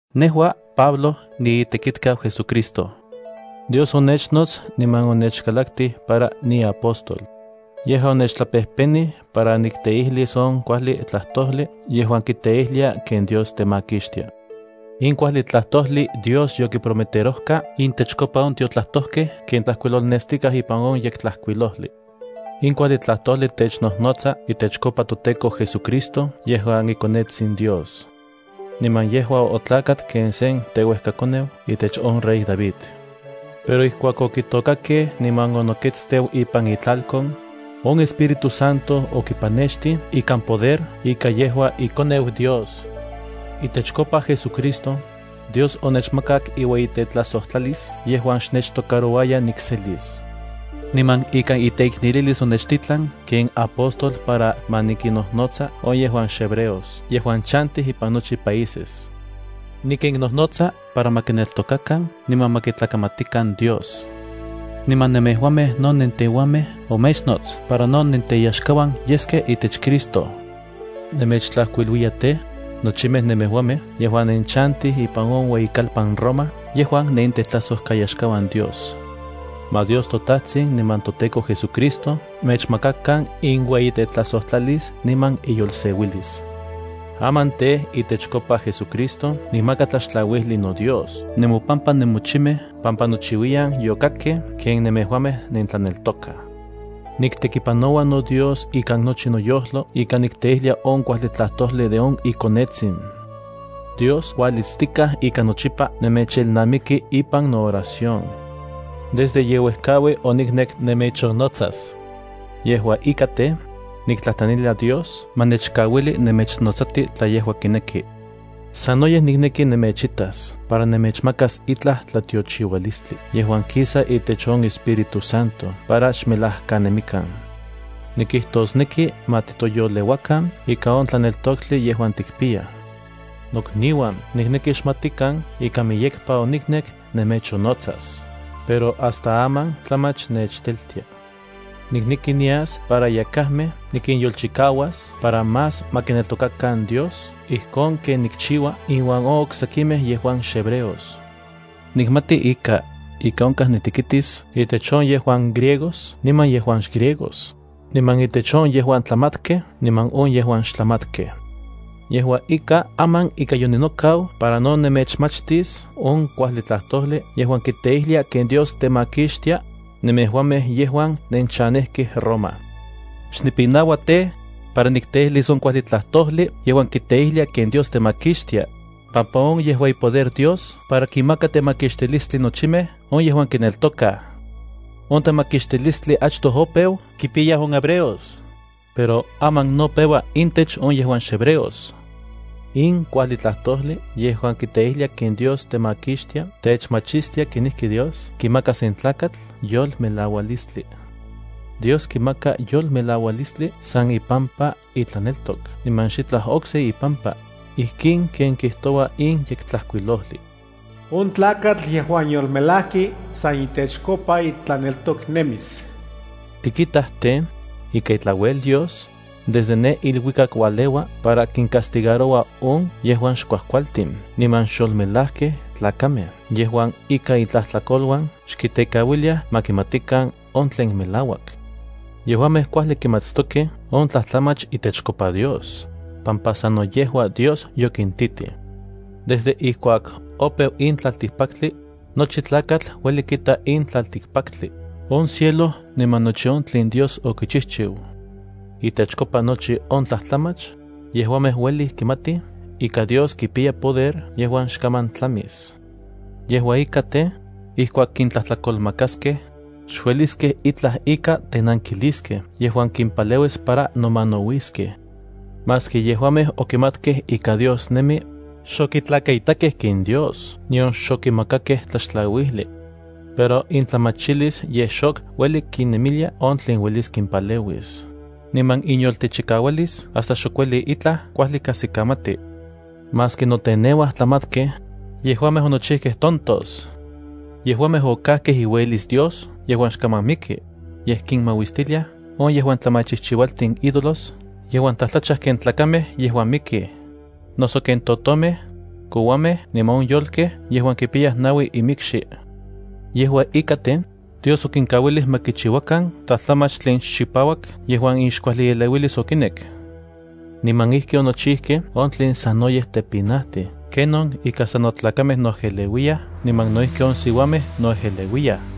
Nejua, Pablo, niitekitkau JesuCristo. Dios onechnots niman onechkalaktij para niapóstol. Yejua onechtlapejpenij para nikteijlis on kuajli tlajtojli yejuan kiteijlia ken Dios temakixtia. In kuajli tlajtojli Dios yokiprometerojka intechkopa on tiotlajtojkej ken tlajkuilolnestikaj ipan on Yektlajkuilojli. In kuajli tlajtojli technojnotsa itechkopa toTEKO JesuCristo yejuan iKonetsin Dios. Niman yejua otlakat ken sen teuejkakoneu itech on rey David. Pero ijkuak okitôkakej niman onokuiteu ipan itlalkon, on Espíritu Santo okipanextij ikan poder ika yejua iKoneu Dios. Itechkopa JesuCristo, Dios onechmakak iueyitetlajsojtlalis yejuan xnechtocarouaya nikselis. Niman ikan iteiknelilis onechtitlan ken apóstol para ma nikinnojnotsa on yejuan xhebreos yejuan chantij ipan nochi países. Nikinnojnotsa para ma kineltokakan niman ma kitlakamatikan Dios. Niman nemejuamej no nenteuamej omechnots para no nenteyaxkauan yeskej itech Cristo. Nemechtlajkuiluiya tej, nochimej nemejuamej yejuan nenchantij ipan on ueyikalpan Roma yejuan nenitetlajsojkayaxkauan Dios. Ma Dios toTajtsin niman toTEKO JesuCristo mechmakakan inueyitetlajsojtlalis niman inyolseuilis. Aman tej, itechkopa JesuCristo nikmaka tlaxtlauijli noDios nemopampa nemochimej pampa nochiuiyan yokakkej ken nemejuamej nentlaneltokaj. Niktekipanoua Dios ikan nochi noyojlo ika nikteijlia on kuajli tlajtojli de on iKonetsin. Dios kualitstikaj ika nochipa nemechelnamiki ipan nooración. Desde ye uejkaui oniknek nemechonnotsas. Yejua ika tej, niktlajtlanilia Dios ma nechkauili nemechnotsati tla yejua kineki. Sanoyej nikneki nemechitas para nemechmakas itlaj tlatiochiualistli yejuan kisa itech on Espíritu Santo para xmelajkanemikan. Nikijtosneki, ma titoyoleuakan ika on tlaneltoktli yejuan tikpiyaj. Nokniuan, nikneki xmatikan ika miyekpa oniknek nemechonnotsas, pero hasta aman tlamach nechteltia. Nikneki nias para yakajmej nikinyolpatlas para más mieyekej ma kineltokakan Dios ijkon ken nikchiua inuan on oksekimej yejuan xhebreos. Nikmati ika, ika onkaj nitekitis intech on yejuan griegos niman yejuan xgriegos, niman intech on yejuan tlamatkej niman on yejuan xtlamatkej. Yejua ika, aman ika yoninokau para no nemechmachtis on kuajli tlajtojli yejuan kiteijlia ken Dios temakixtia nemejuamej yejuan nenchanejkej Roma. Xnipinaua tej, para nikteijlis on kuajli tlajtojli yejuan kiteijlia ken Dios temakixtia, pampa on yejua ipoder Dios para kinmaka temakixtilistli nochimej on yejuan kineltokaj. On temakixtilistli achtoj opeu kipiyaj on hebreos, pero aman no peua intech on yejuan xhebreos. In kuajli tlajtojli yejuan kiteijlia ken Dios temakixtia techmachistia kenijki Dios kimaka sen tlakatl yolmelaualistli. Dios kimaka yolmelaualistli san ipampa itlaneltok niman xitlaj okse ipampa ijkin ken kijtoua in Yektlajkuilojli: “On tlakatl yejuan yolmelajki san itechkopa itlaneltok nemis.” Tikitaj tej, ika itlauel Dios, desde ne iluikak ualeua para kincastigaroua on yejuan xkuajkualtin niman xyolmelajkej tlakamej yejuan ika intlajtlakoluan xkitekauiliaj ma kimatikan on tlen melauak. Yejuamej kuajli kimatstokej on tlajtlamach itechkopa Dios, pampa sano yejua Dios yokintitij. Desde ijkuak opeu in tlaltikpaktli, nochi tlakatl ueli kita in tlaltikpaktli, on cielo niman nochi on tlen Dios okichijchiu. Itechkopa nochi on tlajtlamach, yejuamej ueli kimatij ika Dios kipiya poder yejuan xkaman tlamis niman de on inemilis. Yejua ika tej, ijkuak kintlajtlakolmakaskej, xueliskej itlaj ika tenankiliskej yejuan kimpaleuis para nomanauiskej. Maski yejuamej okimatkej ika Dios nemi, xokitlakaitakej ken Dios nion xokimakakej tlaxtlauijli. Pero intlamachilis yej xok ueli kinemilia on tlen uelis kinpaleuis, niman inyoltechikaualis hasta xok ueli itlaj kuajli kajsikamatij. Maski noteneuaj tlamatkej, yejuamej onochijkej tontos. Yejuamej okikajkej iueyilis Dios yejuan xkaman miki, yej kinmauistiliaj on yejuan tlamachijchiualtin ídolos yejuan tlajtlachaj ken tlakamej yejuan mikij, noso ken totomej, kouamej niman on yolkej yejuan kipiyaj naui inmikxi. Yejua ika tej, Dios okinkauilij ma kichiuakan tlajtlamach tlen xchipauak yejuan inxkuajlieleuilis okinek. Niman ijki onochijkej on tlen sanoyej tepinajti ken on ika sano tlakamej noejeleuiyaj niman no ijki on siuamej noejeleuiyaj.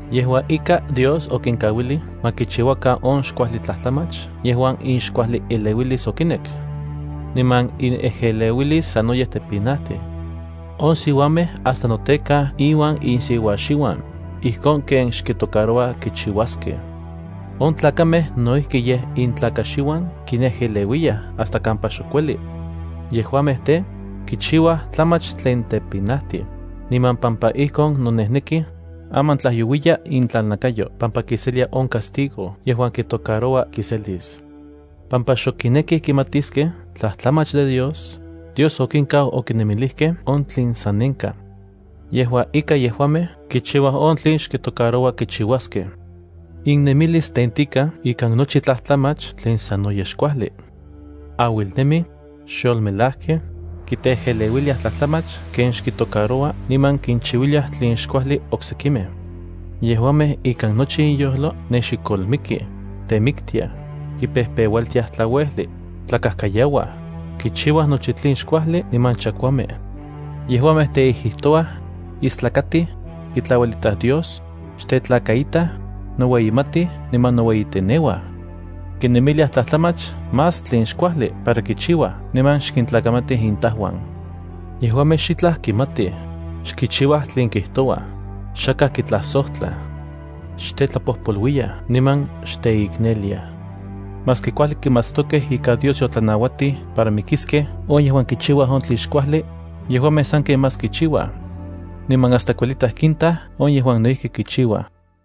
Yejua ika, Dios okinkauilij ma kichiuakan on xkuajli tlajtlamach yejuan inxkuajlieleuilis okinek. Niman inejeleuis sanoyej tepinajtij. On siuamej hasta notekaj inuan insiuaxiuan, ijkon ken xkitocaroua kichiuaskej. On tlakamej no ijki yej intlakaxiuan kinejeleuiyaj hasta kampa xok ueli. Yejuamej tej, kichiuaj tlamach tlen tepinajtij, niman pampa ijkon nonejnekij, aman tlajyouiya intlalnakayo pampa kiselia on castigo yejuan kitocaroua kiselis. Pampa xok kinekij kimatiskej tlajtlamach de Dios, Dios okinkau okinemilijkej on tlen sanenkaj. Yejua ika, yejuamej kichiuaj on tlen xkitocaroua kichiuaskej. Innemilis tentikaj ikan nochi tlajtlamach tlen sanoyej xkuajli. Auilnemij, xyolmelajkej, kiteejeleuiliaj tlajtlamach ken xkitocaroua niman kinchiuiliaj tlen xkuajli oksekimej. Yejuamej ikan nochi inyojlo nexikolmikij, temiktiaj, kipejpeualtiaj tlauejli, tlakajkayauaj, kichiuaj nochi tlen xkuajli niman chakuamej. Yejuamej teijijtouaj, istlakatij, kitlauelitaj Dios, xtetlakaitaj, noueyimatij niman noueyiteneuaj. Kinemiliaj tlajtlamach más tlen xkuajli para kichiuaj niman xkintlakamatij intajuan. Yejuamej xitlaj kimatij, xkichiuaj tlen kijtouaj, xakaj kitlajsojtlaj, xtetlapojpoluiyaj niman xteikneliaj. Maski kuajli kimatstokej ika Dios yotlanauatij para mikiskej on yejuan kichiuaj on tlen xkuajli, yejuamej sanken más kichiuaj. Niman hasta kuelitaj kintaj on yejuan no ijki kichiuaj.